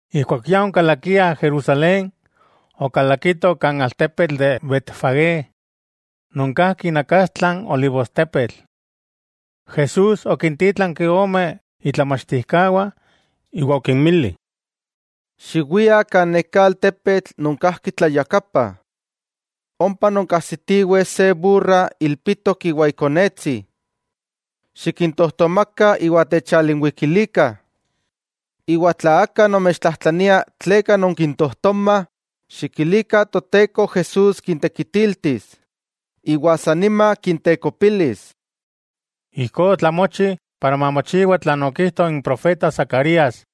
Ijkuak ya onkalakiah Jerusalén, okalakitoh kan altepetl de Betfagé, non kajki inakastla n olivostepetl. Jesús okintítlanki ome itlamachtijkawah, iwa okinmili: —Xiwiah kan neká altepetl non kajki tlayakapa. Ompa nonkajsitiweh se burra ilpitok iwa ikonetsi. Xikintojtomakah iwa techalinwikilikah. Iwa tla aka nomechtlajtlania tleka nonkintojtomah, xikilikah Toteko Jesús kintekitiltis, iwa san nima kintekopilis. Ijkó otlamochi para mamochiwa tlan okijto n profeta Zacarías: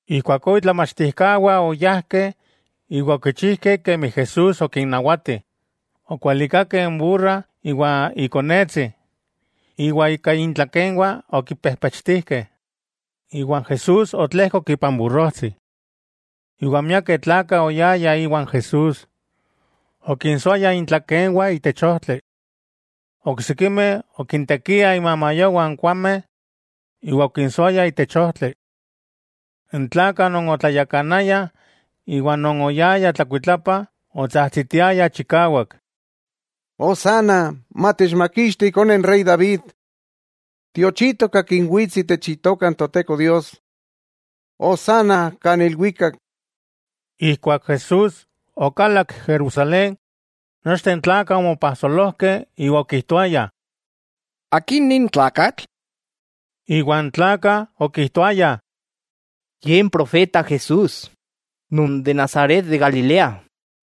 Ijkuakó itlamachtijkawah oyajkeh iwa okichijkeh kemi Jesús okinnawati. Okualikakeh n burra iwa ikonetsi, iwa ika intlakenwah okipejpechtijkeh. Iwa Jesús otlejkok ipan burrojtsi. Iwa miakeh tlakah oyayah iwan Jesús, okinsoayah intlakenwah itech ojtli. Oksikimeh okintekiah imamayowah n kuameh iwa okinsoayah itech ojtli. N tlakah non otlayakanayah, iwa non oyayah tlakuitlapa otsajtsitiayah chikawak: —¡Hosanna! ¡Matechmakixti ikone n rey David! ¡Tiochitok akin wits itech Itoka n Toteko Dios! ¡Hosanna kan ilwikak! Ijkuak Jesús okalak Jerusalén, nochteh n tlakah omopajsolojkeh, iwa okijtoayah: —¿Akin nin tlakatl? Iwa n tlakah okijtoayah: —Ye n profeta Jesús, non de Nazaret de Galilea.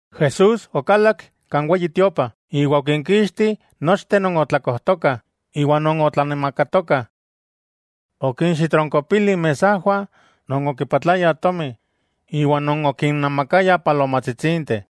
Jesús okalak kan Weyi Tiopa iwa okinkixti nochteh non otlakojtokah iwa non otlanamakatokah. Okinxitronkopili inmesajwah non okipatlayah tomi, iwa non okinnamakayah palomajtsitsinteh.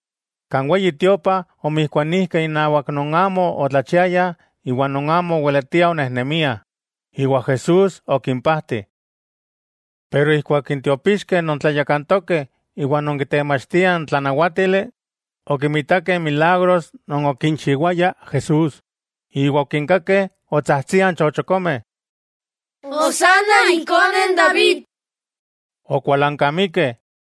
Kan Weyi Tiopa omijkuanijkeh inawak non amo otlachiayah iwa non amo oweletiah onejnemiah, iwa Jesús okimpajti. Pero ijkuak n tiopixkeh non tlayakantokeh iwa non kitemachtiah n tlanawatili, okimitakeh n milagros non okinchiwaya Jesús, iwa okinkakeh otsajtsiah n chochokomeh: “¡Hosanna ikone n David!”, okualankamikeh.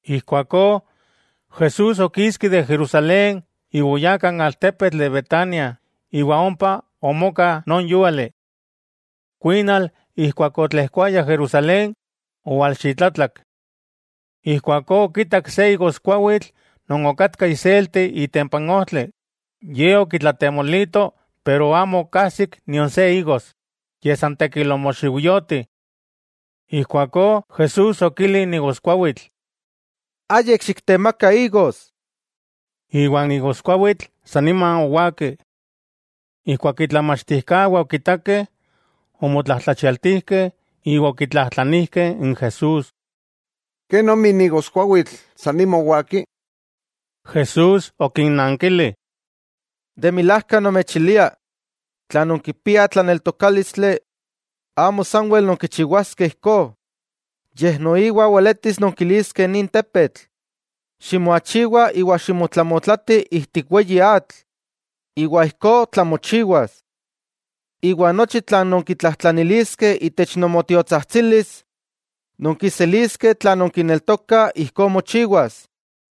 Ijkuakó Jesús okiski de Jerusalén iwa oyá kan altepetl de Betania iwa ompa omoka non yúali. Kuinal, ijkuak otlejkoaya Jerusalén, owalxitlatlak. Ijkuakó okitak se igoskuawitl non okatka iselti itempa n ojtli, Ye okitlatemolito pero amo okajsik nion se igos, yej san tekil omoxiujyoti. Ijkuakó Jesús okili n igoskuawitl: —¡Ayik xiktemaka igos! Iwa n igoskuawitl sa nima owaki. Ijkuak itlamachtijkawah okitakeh, omotlajtlachialtijkeh iwa okitlajtlanijkeh n Jesús: —¿Kenomi n igoskuawitl sa nima owaki? Jesús okinnankili: —De milajka nomechilia, tla nonkipiah tlaneltokálistli, amo sanwel nonkichiwaskeh ijkó, yej noiwa weletis nonkiliskeh nin tepetl: “Ximoachiwa iwa ximotlamotlati ijtik weyi atl”, iwa ijkó tlamochiwas. Iwa nochi tlan nonkitlajtlaniliskeh itech nomotiotsajtsilis, nonkiseliskeh tla nonkineltokah ijkó mochiwas.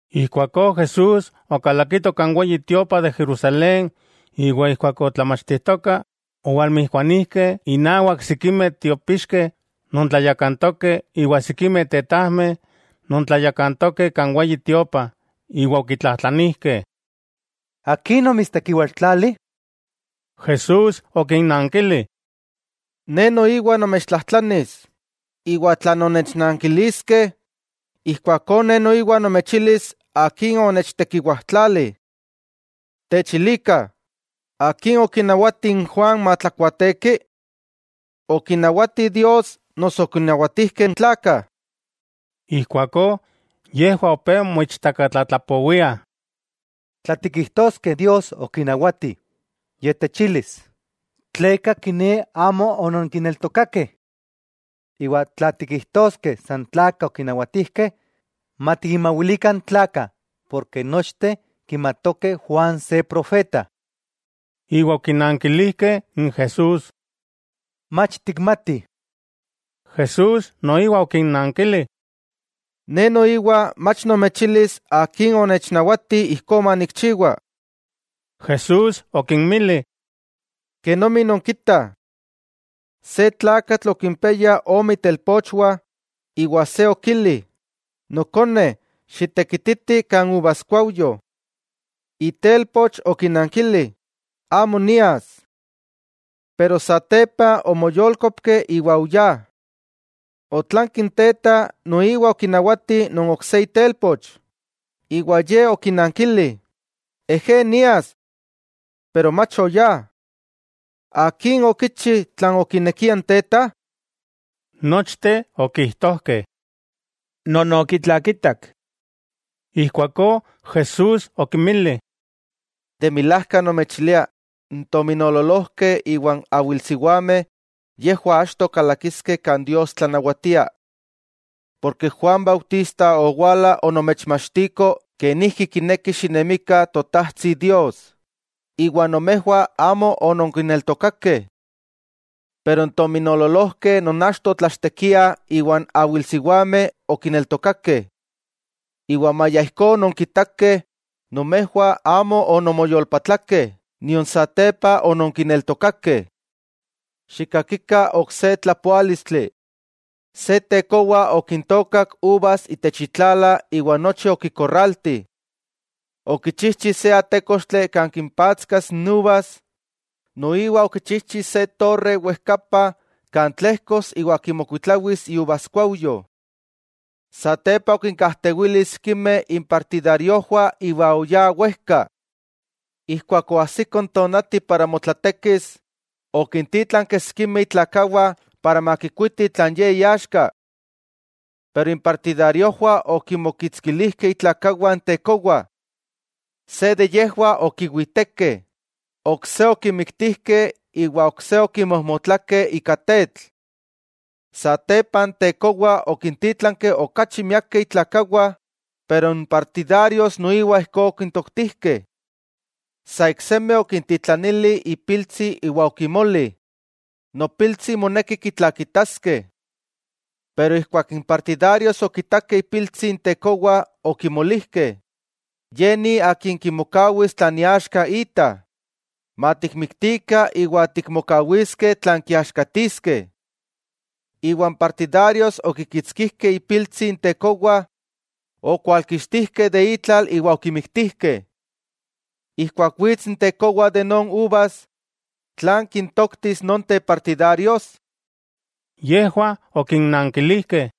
Ijkuakó Jesús okalakito kan Weyi Tiopa de Jerusalén iwa ijkuak otlamachtijtoka, owalmijkuanijkeh inawak sikimeh tiopixkeh non tlayakantokeh iwa sikimeh tetajmeh non tlayakantokeh kan Weyi Tiopa iwa okitlajtlanijkeh: —¿Akin omitstekiwajtlali? Jesús okinnankili: —Ne noiwa nomechtlajtlanis, iwa tla nonnechnankiliskeh, ijkuakó Ne noiwa nomechilis akin onechtekiwajtlali. Techilikah, ¿akin okinawati n Juan matlakuaateki? ¿Okinawati Dios noso okinawatijkeh n tlakah? Ijkuakó yejwah opé moichtakatlatlapowiah: —Tla tikijtoskeh Dios okinawati, Ye techilis: “¿Tleka kiné amo ononkineltokakeh?” Iwa tla tikijtoskeh san tlakah okinawatijkeh, matikinmawilikah n tlakah, porke nochteh kimatokeh Juan se profeta. Iwa okinankilijkeh n Jesús: —Mach tikmatih. Jesús noiwa okinnankili: —Ne noiwa mach nomechilis akin onechnawati ijkó manikchiwa. Jesús okinmili: —Kenomi nonkitah. Se tlakatl okimpiaya ome itelpochwah, iwa se okili: “Nokone, xitekititi kan uvaskuajyo.” Itelpoch okinankili: “¡Amo nias!” Pero satepa omoyolkopki iwa oyá. Otlanki n teta noiwa okinawati non ok se itelpoch, iwa ye okinankili: “Ejé, nias.” Pero mach oyá. ¿Akin okichi tlan okinekia n teta? Nochteh okijtojkeh: —Non okitlakitak. Ijkuakó Jesús okinmili: —De milajka nomechilia n tominoololojkeh iwa n awilsiwameh, yejwah achto kalakiskeh kan Dios tlanawatia. Porke Juan Bautista owala onomechmachtiko kenijki kineki xinemikah Totajtsi Dios, iwa nomejwah amo ononkineltokakeh. Pero n tominoololojkeh non achto otlachtekiah iwa n awilsiwameh okineltokakeh. Iwa maya ijkó ononkitakeh, nomejwah amo ononmoyolpatlakeh nion satepa ononkineltokakeh. 'Xikkakikah ok se tlapoálistli: Se tekowa okintookak uvas itech itlala iwa nochi okikorralti. Okichijchi se atékochtli kan kimpatskas n uvas, noiwa okichijchi se torre wejkapa kan tlejkos iwa kimokuitlawis iuvaskuajyo. 'Satepa okinkajtewili sikimeh impartidariojwah iwa oyá wejka. Ijkuak oajsiko n tonati para motlatekis, okintítlanki sikimeh itlakawah para makikuitih tlan ye iaxka. Pero impartidariojwah okinmokitskilijkeh itlakawah n tekowa. Se de yejwah okiwitekeh, ok se okimiktijkeh iwa ok se okimojmotlakeh ika tetl. Satepa n tekowa okintítlanki okachi miakeh itlakawah, pero n partidarios noiwa ijkó okintoktijkeh. 'Sa iksemi, okintitlanili ipiltsi iwa okimoli: “Nopiltsi moneki kitlakitaskeh.” Pero ijkuak n partidarios okitakeh ipiltsi n tekowa okimolijkeh: “Ye ni akin kimokawis tlan iaxka ita, matikmiktikah iwa tikmokawiskeh tlan kiaxkatiskeh.” Iwa n partidarios okikitskijkeh ipiltsi n tekowa, okwalkixtijkeh de itlal iwa okimiktijkeh. Ijkuak wits n tekowa de non uvas, ¿tlan kintoktis nonteh partidarios? Yejwah okinankilijkeh: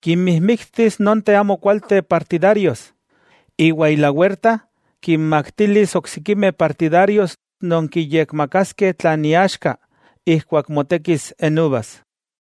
—Kinmijmiktis nonteh amo kualteh partidarios, iwa ilawerta kinmaktilis oksikimeh partidarios non kiyekmakaskeh tlan iaxka ijkuak motekis n uvas.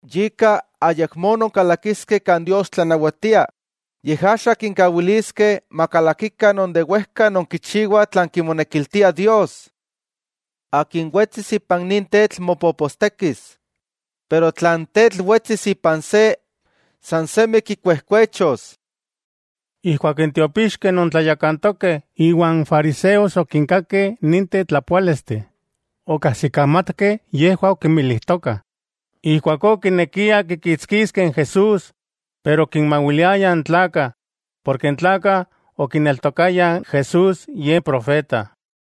'Yika, ayakmó nonkalakiskeh kan Dios tlanawatia, yej axa kinkawiliskeh makalakikah non de wejka nonkichiwah tlan kimonekiltia Dios. Akin wetsis ipan nin tetl mopopostekis, pero tla n tetl wetsis ipan se, san semi kikuejkuechos. Ijkuak n tiopixkeh non tlayakantokeh iwa n fariseos okinkakeh ninteh tlapoálisteh, okajsikamatkeh yejwah okinmilijtoka. Ijkuakó okinekiah kikitskiskeh n Jesús, pero okinmawiliayah n tlakah, porke n tlakah okineltokayah Jesús Ye profeta.